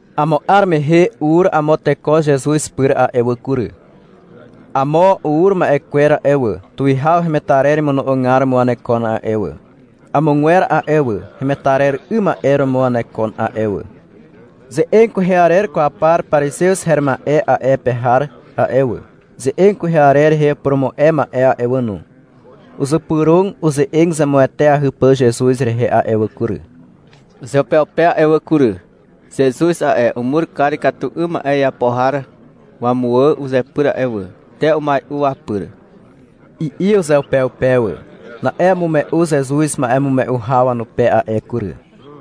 Amo 'ar mehe ur amo teko Zezuz pyr a'e wà kury. Amo ur ma'e kwer a'e wà, tuwihaw hemetarer imono'ogar romo wanekon a'e wà. Amogwer a'e wà, hemetarer 'ym ma'e romo wanekon a'e wà. Ze'eg kwehe arer kwaw par parizew her ma'e a'e pe har a'e wà, ze'eg kwehe arer rehe upurumu'e ma'e a'e wà no, uzypyrog uze'eg zemueteahy pà Zezuz rehe a'e wà kury, uzeupeupe a'e wà kury. — Zezuz a'e, umur kar ikatu 'ym ma'e iapo har wamuwà uzepyr a'e wà. Te umai'u wapyr, i'i uzeupeupe wà. Na'e umume'u Zezuz ma'emume'u haw wanupe a'e kury.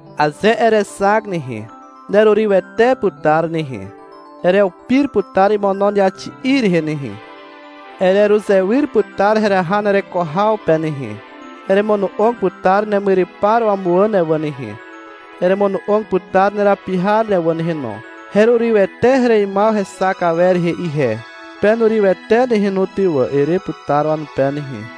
Aze erexak nehe, nerurywete putar nehe. Ereupir putar imono neaxi'i rehe nehe. Ereruzewyr putar heraha nereko haw pe nehe. Eremono'og putar nemyrypar wamuwà ne wà nehe, eremono'og putar nerapi har ne wà nehe no. — Herurywete hereimaw hexak awer rehe ihe. Penurywete nehe no ty wà, ere putar wanupe nehe.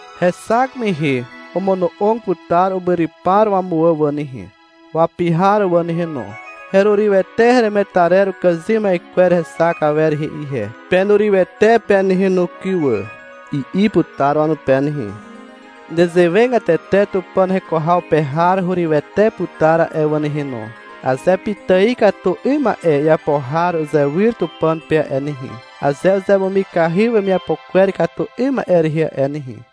Hexak mehe omono'og putar umyrypar wamuwà wà nehe, wapi har wà nehe no. — Herurywete heremetarer ukàzym ma'e kwer hexak awer rehe ihe. Penurywete pe nehe no kyn wà, i'i putar wanupe nehe. Nezewegatete Tupàn heko haw pe har hurywete putar a'e wà nehe no, aze pitài ikatu 'ym ma'e iapo har uzewyr Tupàn pe a'e nehe, aze uzemumikahy wemiapo kwer ikatu 'ym ma'e rehe a'e nehe.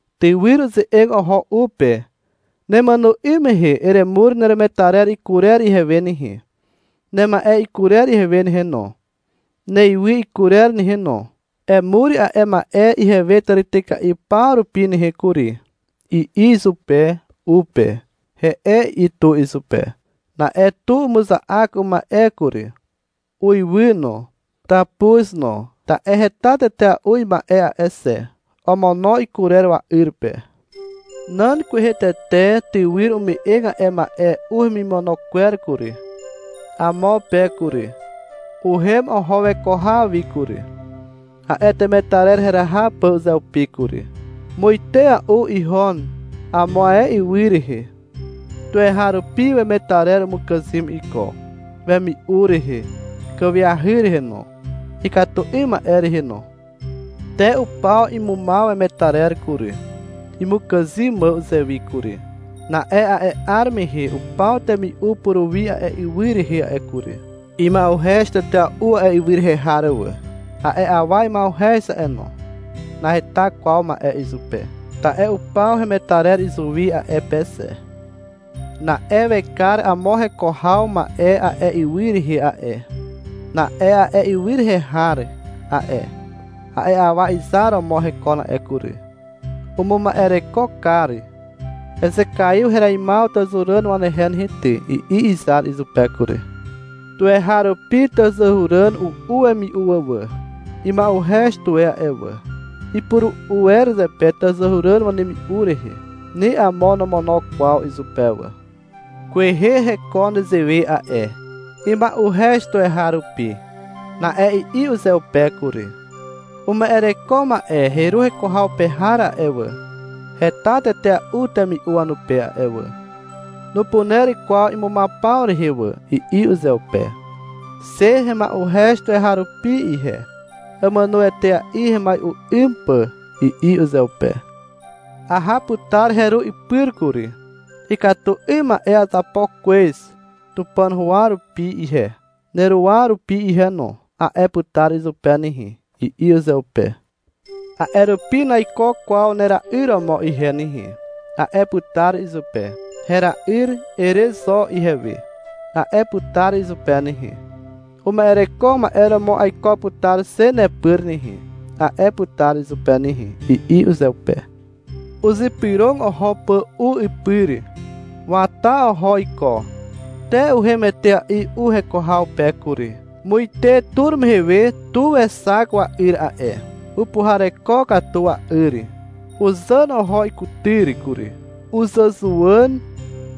Tywyr uze'eg oho u pe. — Nemàno 'ym mehe emur neremetarer ikurer ihewe nehe, nema'e ikurer ihewe nehe no, neywy ikurer nehe no. Emur a'e ma'e ihewe tàrityka'i paw rupi nehe kury, i'i izupe u pe. — He'e, i'i tu izupe. Na'e tu umuza'ak uma'e kury, uiwy no, tàpuz no, ta'e heta tetea'u ima'e a'e xe. Omono ikurer wa'yr pe. Nan kwehe tete tywyr ume'eg a'e ma'e u hemimono kwer kury, amo pe kury. Uhem oho weko haw wi kury, a'e temetarer heraha pà uzeupi kury. Muitea'u ihon, amo ae ywy rehe. Tuweharupi wemetarer umukàzym iko, wemi'u rehe, kàwiahy rehe no, ikatu 'ym ma'e rehe no. Te upaw imumaw wemetarer kury, imukàzym mà uzewi kury. Na'e a'e 'ar mehe upaw temi'u puruwi a'e ywy rehe a'e kury. Ima'uhez tetea'u a'e ywy rehe har wà. A'e awa ima'uhez a'e no. Naheta kwaw ma'e izupe, ta'e upaw hemetarer izuwi a'e pe xe. Na'e wekar amo heko haw ma'e a'e ywy rehe a'e. Na'e a'e ywy rehe har a'e, a'e awa izar romo hekon a'e kury. Umuma'ereko kar. — Ezekaiw hereimaw tàzàhuràn wanehe nehe ty, i'i izar izupe kury. Tuweharupi tàzàhuràn u'u wemi'u wà. Ima'uhez tuwe a'e awa. Ipuru'u wer zepe tàzàhuràn wanemi'u rehe. Ni amo nomono kwaw izupe wà. Kwehe hekon nezewe a'e. Ima'uhez tuweharupi. Na'e i'i uzeupe kury. — Uma'ereko ma'e heru heko haw pe har a'e wà, heta tetea'u temi'u wanupe a'e wà. Nupuner kwaw imumaw paw rehe wà, i'i uzeupe. — Xe hema'uhez tuweharupi ihe. Àmàno etea'i hemai'u 'ym pà, i'i uzeupe. — Aha putar heru ipyr kury. — Ikatu 'ym ma'e azapo kwez, Tupàn huwa rupi ihe, neruwa rupi ihe no, a'e putar izupe nehe, i'i uzeupe. — A'e rupi naiko kwaw nera'yr romo ihe nehe, a'e putar izupe. — Hera'yr, ere zo ihewe, a'e putar izupe nehe. — Uma'ereko ma'e romo aiko putar xe nepyr nehe, a'e putar izupe nehe, i'i uzeupe. Uzypyrog oho pà u ipyr. Wata oho iko, te uhem etea'i u heko haw pe kury. Muite tur mehe we tu wexak wa'yr a'e. Upuhareko katu wa'yr. Uzàn oho ikutyr kury. Uzàzuwàn.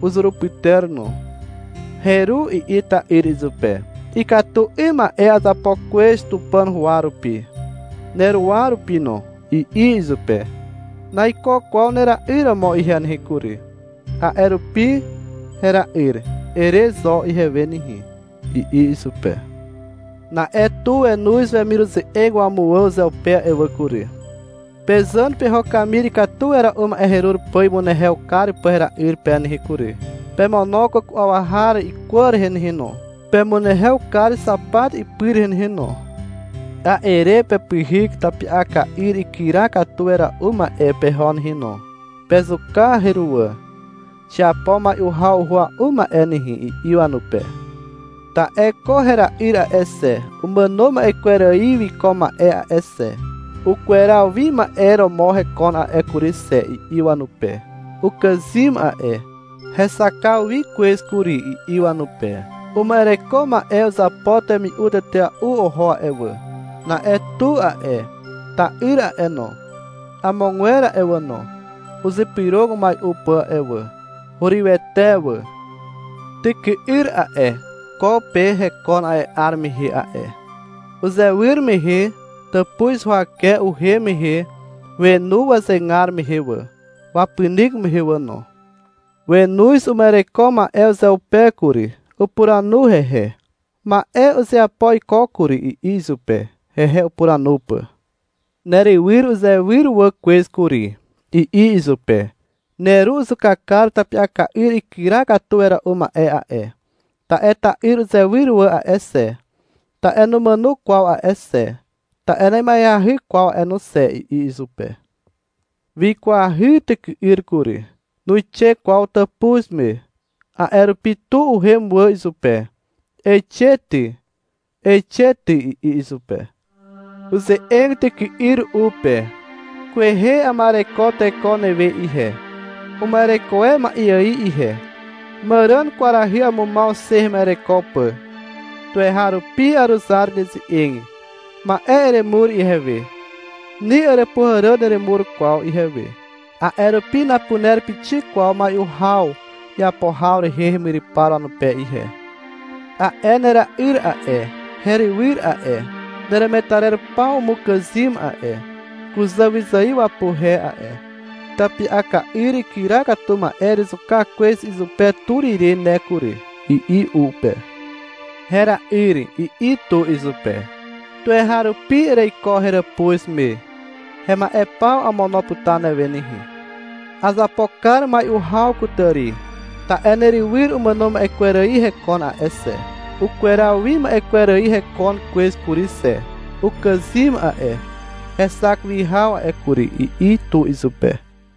Uzurupyter no. — Heru, i'i ta'yr izupe. — Ikatu 'ym ma'e azapo kwez Tupàn huwa rupi, neruwa rupi no, i'i izupe. — Naiko kwaw nera'yr romo ihe nehe kury, a'e rupi — Hera'yr, ere zo ihewe nehe, i'i izupe. Na'e tu wenoz wemiruze'eg wamuwà uzeupe a'e wà kury. — Pezàn peho kamir ikatu wera'u ma'e herur pà imunehew kar pà hera'yr pe nehe kury. Pemono kwàku'aw har ikwà rehe nehe no. Pemunehew kar xapat ipy rehe nehe no. A'e re pepyhyk tapi'aka'yr ikyra katu wera'u ma'e peho nehe no, pezuka heruwà. Xiapo mai'u haw uhua'u ma'e nehe, i'i wanupe. — Ta'e ko hera'yr a'e xe, umàno ma'e kwer ài wiko ma'e a'e xe, ukweraw wi ma'e romo hekon a'e kury xe, i'i wanupe. — Ukàzym a'e, hexakaw wi kwez kury, i'i wanupe. Uma'ereko ma'e uzapo temi'u tetea'u oho a'e wà. Na'e tu a'e, ta'yr a'e no, amogwer a'e wà no, uzypyrog umai'u pà a'e wà. Hurywete wà. Tyky'yr a'e, ko pe hekon a'e 'ar mehe a'e. Uzewyr mehe tàpuz huwake uhem mehe wenu wazegar mehe wà, wapynyk mehe wà no. Wenoz uma'ereko ma'e uzeupe kury. Upuranu hehe. — Ma'e uzeapo iko kury, i'i izupe, hehe upuranu pà. — Nerywyr uzewyr wà kwez kury, i'i izupe. — Neru uzuka kar tapi'aka'yr ikyra katu wera'u ma'e a'e, ta'e ta'yr uzewyr wà a'e xe, ta'e numàno kwaw a'e xe, ta'e na'ima'eahy kwaw a'e no xe, i'i izupe. Wikwahy tyky'yr kury. Nuixe kwaw tàpuz me. A'e rupi tu uhem wà izupe. — Eixe ty, eixe ty, i'i izupe. Uze'eg tyky'yr u pe. — Kwehe ama'ereko teko newe ihe, uma'ereko e ma'e ài ihe, màràn kwarahy amumaw xe hema'ereko pà. Tuweharupi aruzar neze'eg. Ma'e eremur ihewe. Ni àràpuhàràn neremur kwaw ihewe. A'e rupi napuner pixik kwaw mai'u haw iapo haw rehe hemyrypar wanupe ihe. A'e nera'yr a'e, herywyr a'e, neremetarer paw umukàzym a'e, kuzà wyzài wapuhe a'e. Tapi'aka'yr ikyra katu ma'e erezuka kwez izupe tur ire ne kury, i'i u pe. Hera'yr, i'i tu izupe. — Tuweharupi ereiko heràpuz me. Hema'e paw amono putar newe nehe. Azapo kar mai'u haw kutàri, ta'e nerywyr umàno ma'e kwer ài hekon a'e xe, ukweraw wi ma'e kwer ài hekon kwez kury xe. Ukàzym a'e, hexak wi haw a'e kury, i'i tu izupe.